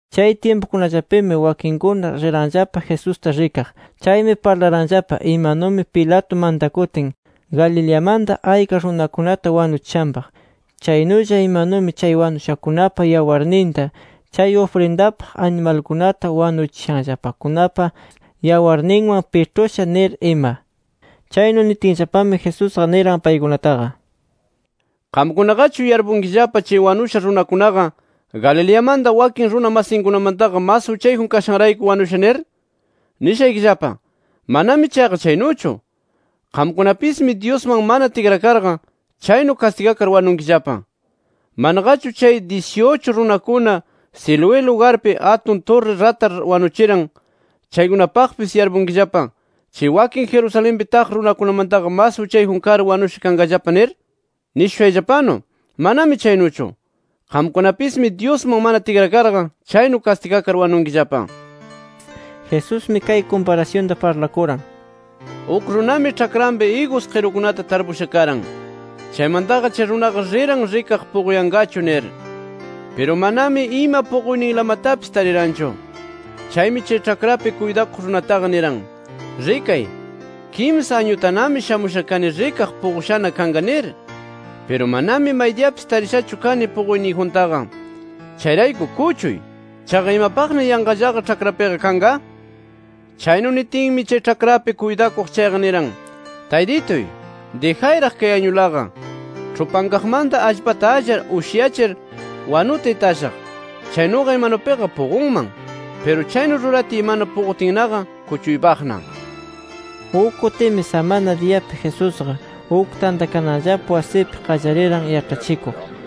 Chay tyimpukunallapimi, wakinkuna riranllapa Jesusta rikaq. Chaymi parlaranllapa imanumi Pilato mantakutin Galileamanta ayka runakunata wanuchishanpaq. Chaynulla imanumi chay wanushakunapa yawarninta, chay ufrindapaq animalkunata wanuchishanllapakunapa yawarninwan piĉhusha nir ima. Chaynu nitinllapami, Jesusqa niran paykunataqa: “¿Qamkunaqachu yarpunkillapa chay wanusha runakunaqa Galileamanta wakin runa masinkunamantaqa mas uchayjun kashanrayku wanusha nir? Nishaykillapa: Manami chayqa chaynuchu. Qamkunapismi Dyusman mana tikrakarqa, chaynu kastigakar wanunkillapa. ¿Manaqachu chay dyisi-uchu runakunata Siloé lugarpi atun turri ratar wanuchiran chaykunapaqpis yarpunkillapa, chay wakin Jerusalenpi taq runakunamantaqa mas uchayjun kar wanusha kanqallapa, nir? Nishushayllapanu manami chaynuchu. Qamkunapismi Dyusman mana tikrakarqa, chaynu kastigakar wanunkillapa”. Jesusmi kay kumparasyunta parlakuran: “Uk runami, ĉhakranpi igus qirukunata tarpusha karan. Chaymantaqa chay runaqa riran rikaq puquyanqachu nir. Piru manami ima puquyninlamatapis tariranchu. Chaymi chay ĉhakrapi kuytakuq runataqa niran: ‘Rikay, kimsa añutanami shamusha kani rikaq puqushana kanqa nir. Piru manami maydiyapis tarishachu kani puquyniyjuntaqa. Chayrayku kuchuy. ¿Chaqa imapaqna yanqallaqa ĉhakrapiqa kanqa?’ Chaynu nitinmi, chay ĉhakrapi kuytakuq chayqa niran: ‘Taytituy, dijayraq kay añulaqa. Ĉhupankaqmanta allpata allar ushyachir, wanuta itashaq. Chaynuqa imanupiqa puqunman. Piru chaynu ruratiy mana puqutinnaqa, kuchuypaqna’”. Uk kutimi samana diyapi Jesusqa uk tantakananllapa wasipi qallariran yaĉhachikuq.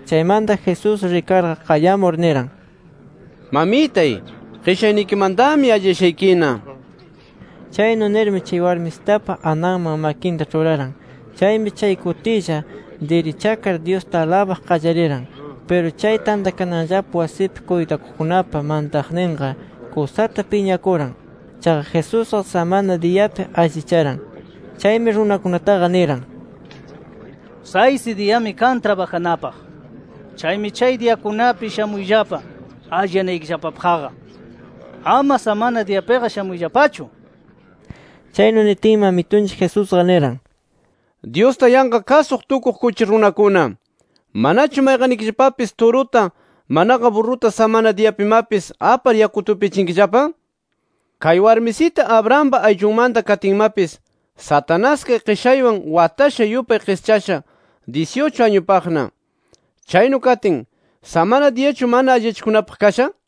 Chaymanta Jesús rikarqa, qayamur niran: —Mamitay, qishaynikimantami alliyashaykina nir. Chaynu nirmi, chay warmisitapa ananman makinta ĉhuraran. Chaymi chay kutilla dirichakar, Dyusta alabaq qallariran. Piru chay tantakananllapa wasipi kuytakuqkunapa mantaqninqa kusata piñakuran. Chaqa Jesusqa samana diyapi allicharan. Chaymi runakunataqa niran: —Saysi diyami kan trabajanapaq. Chaymi chay diyakunapi shamuyllapa alliyanaykillapapaqqa. Ama samana diyapiqa shamuyllapachu. Chaynu nitinmi Amitunchik Jesusqa niran: —Dyusta yanqa kasuq tukuq, kuchi runakuna, ¿manachu mayqannikillapapis turuta manaqa burruta samana diyapimapis, apar yakuta upyachinkillapa? Kay warmisita Abrahampa ayllunmanta katinmapis, Satanás kay qishaywan watasha yupay qischasha dyisi-uchu añupaqna. Chaynu katin, ¿samana diyachu mana alliyachikunapaq kasha?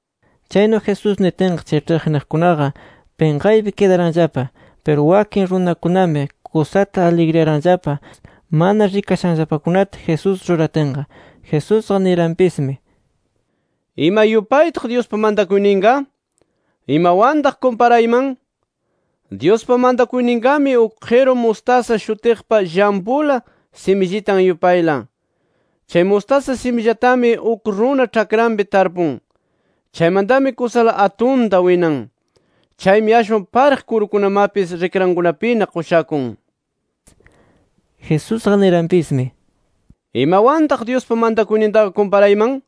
Chaynu Jesús nitinqa, chay ĉhiqniqkunaqa pinqaypi kidaranllapa. Piru wakin runakunami kusata aligriyaranllapa mana rikashanllapakunata Jesús ruratinqa. Jesusqa niranpismi: “¿Ima yupaytaq Dyuspa mantakuyninqa? ¿Imawantaq kumparayman? Dyuspa mantakuyninqami, uk qiru mustasa shutiqpa llampula simillitan yupayla. Chay mustasa simillatami uk runa ĉhakranpi tarpun. Chaymantami kusala atunta winan. Chaymi ashwan pariq kurukunamapis rikrankunapina qushakun”. Jesusqa niranpismi: “¿Imawantaq Dyuspa mantakuynintaqa kumparayman?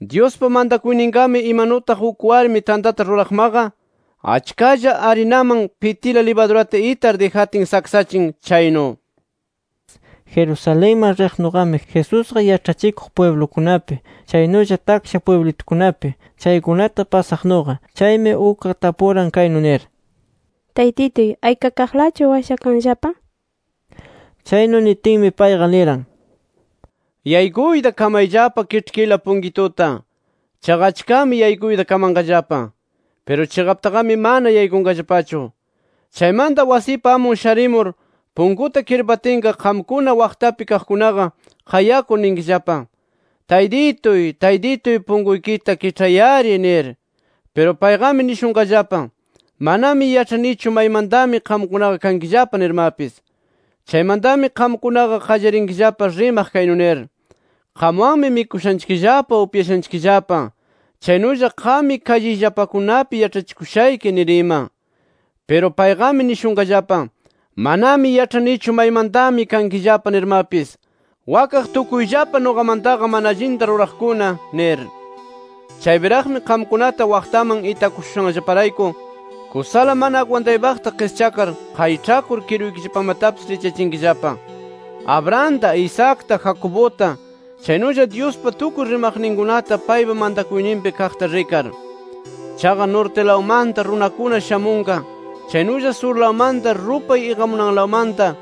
Dyuspa mantakuyninqami imanutaq uk warmi tantata ruraqmaqa achkalla arinaman pitila libadurata itar dijatin saksachin chaynu”. Jerusalenman riqnuqami, Jesusqa yaĉhachikuq pwiblukunapi, chaynulla taksha pwiblitukunapi chaykunata pasaqnuqa. Chaymi ukqa tapuran kaynu nir: —Taytituy, ¿aykakaqlachu washakanllapa? nir. Chaynu nitinmi, payqa niran: “Yaykuyta kamayllapa kiĉhkila punkituta. Chaqa achkami yaykuyta kamanqallapa. Piru chiqaptaqami mana yaykunqallapachu. Chaymanta wasipa amun sharimur punkuta kirpatinqa, qamkuna waqtapi kaqkunaqa, qayakur ninkillapa: ‘Taytituy Taytituy punkuykita kiĉhay-ari’ nir. Piru payqami nishunqallapa: ‘Manami yaĉhanichu maymantami qamkunaqa kankillapa nirmapis’. Chaymantami qamkunaqa qallarinkillapa rimaq kaynu nir: ‘Qamwanmi mikushanchikllapa, upyashanchikllapa. Chaynulla qammi kalliyllapakunapi yaĉhachikushayki’ nir ima. Piru payqami nishunqallapa: ‘Manami yaĉhanichu maymantami kankillapa nirmapis. ¡Wakaq tukuyllapa nuqamantaqa mana allinta ruraqkuna!’ nir. “Chaypiraqmi qamkunata waqtaman itakushushanllaparayku kusala mana agwantaypaqta qischakar, qayĉhakur kiruykillapamatapis richyachinkillapa, Abrahamta, Isaacta, Jacobuta chaynulla Dyuspa tukuy rimaqninkunata paypa mantakuyninpi kaqta rikar. Chaqa nortilawmanta runakuna shamunqa, chaynulla surlawmanta, rupay iqamunanlawmanta,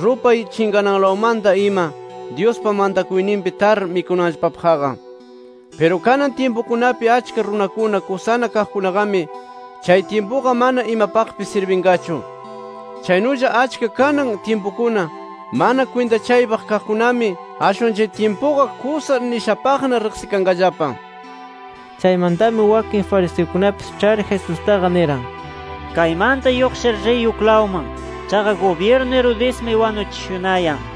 rupay chinqananlawmanta ima, Dyuspa mantakuyninpi tar mikunanllapapaqqa. Piru kanan tyimpukunapi achka runakuna kusana kaqkunaqami, chay tyimpuqa mana imapaqpis sirbinqachu. Chaynulla achka kanan tyimpukuna mana kwintachaypaq kaqkunami, ashwan chay tyimpuqa kusa nishapaqna riqsikanqallapa”. Chaymantami wakin fariseukunapis ĉhar Jesustaqa niran: —Kaymanta lluqshir, riy uklawman. Chaqa gubyirnu Herodesmi wanuchishunayan nir.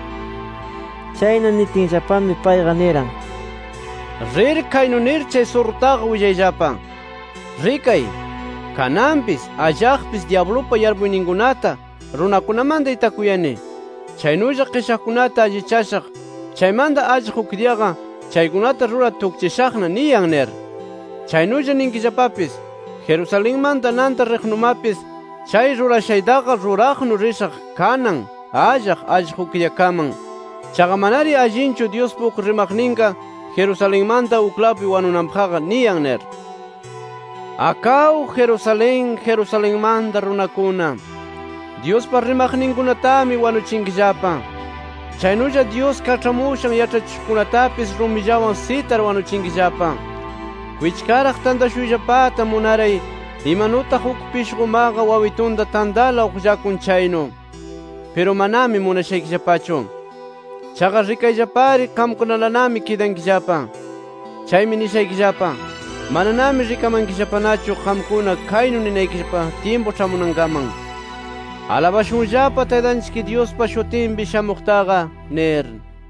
Chaynu nitinllapami, payqa niran: —Rir kaynu nir chay surrutaqa willayllapa: ‘Rikay. Kananpis, allaqpis dyablupa yarpuyninkunata runakunamanta itakuyani. Chaynulla qishaqkunata allichashaq chaymanta allaq uk diyaqa chaykunata rurar tukchishaqna’ niyan nir. Chaynulla ninkillapapis: ‘Jerusalenman nanta riqnumapis chay rurashaytaqa ruraqnu rishaq kanan, allaq, allaq uk diyakaman. Chaqa manari allinchu Dyuspa uk rimaqninqa Jerusalenmanta uklawpi wanunanpaqqa’ niyan nir. “¡Akaw Jerusalén, Jerusalenmanta runakuna! Dyuspa rimaqninkunatami wanuchinkillapa. Chaynulla Dyus kaĉhamushan yaĉhachishuqkunatapis rumillawan sitar wanuchinkillapa. Kwichkaraq tantashuyllapata munaray, imanutaq uk pishqumaqa wawitunta tantala uqllakun chaynu. Piru manami munashaykillapachu. Chaqa rikayllapari, qamkunalanami kidankillapa. Chaymi nishaykillapa: Mananami rikamankillapanachu qamkuna kaynu nimanaykillapa tyimpu ĉhamunankaman: ‘¡Alabashunllapa Taytanchik Dyuspa shutinpi shamuqtaqa!’ nir”.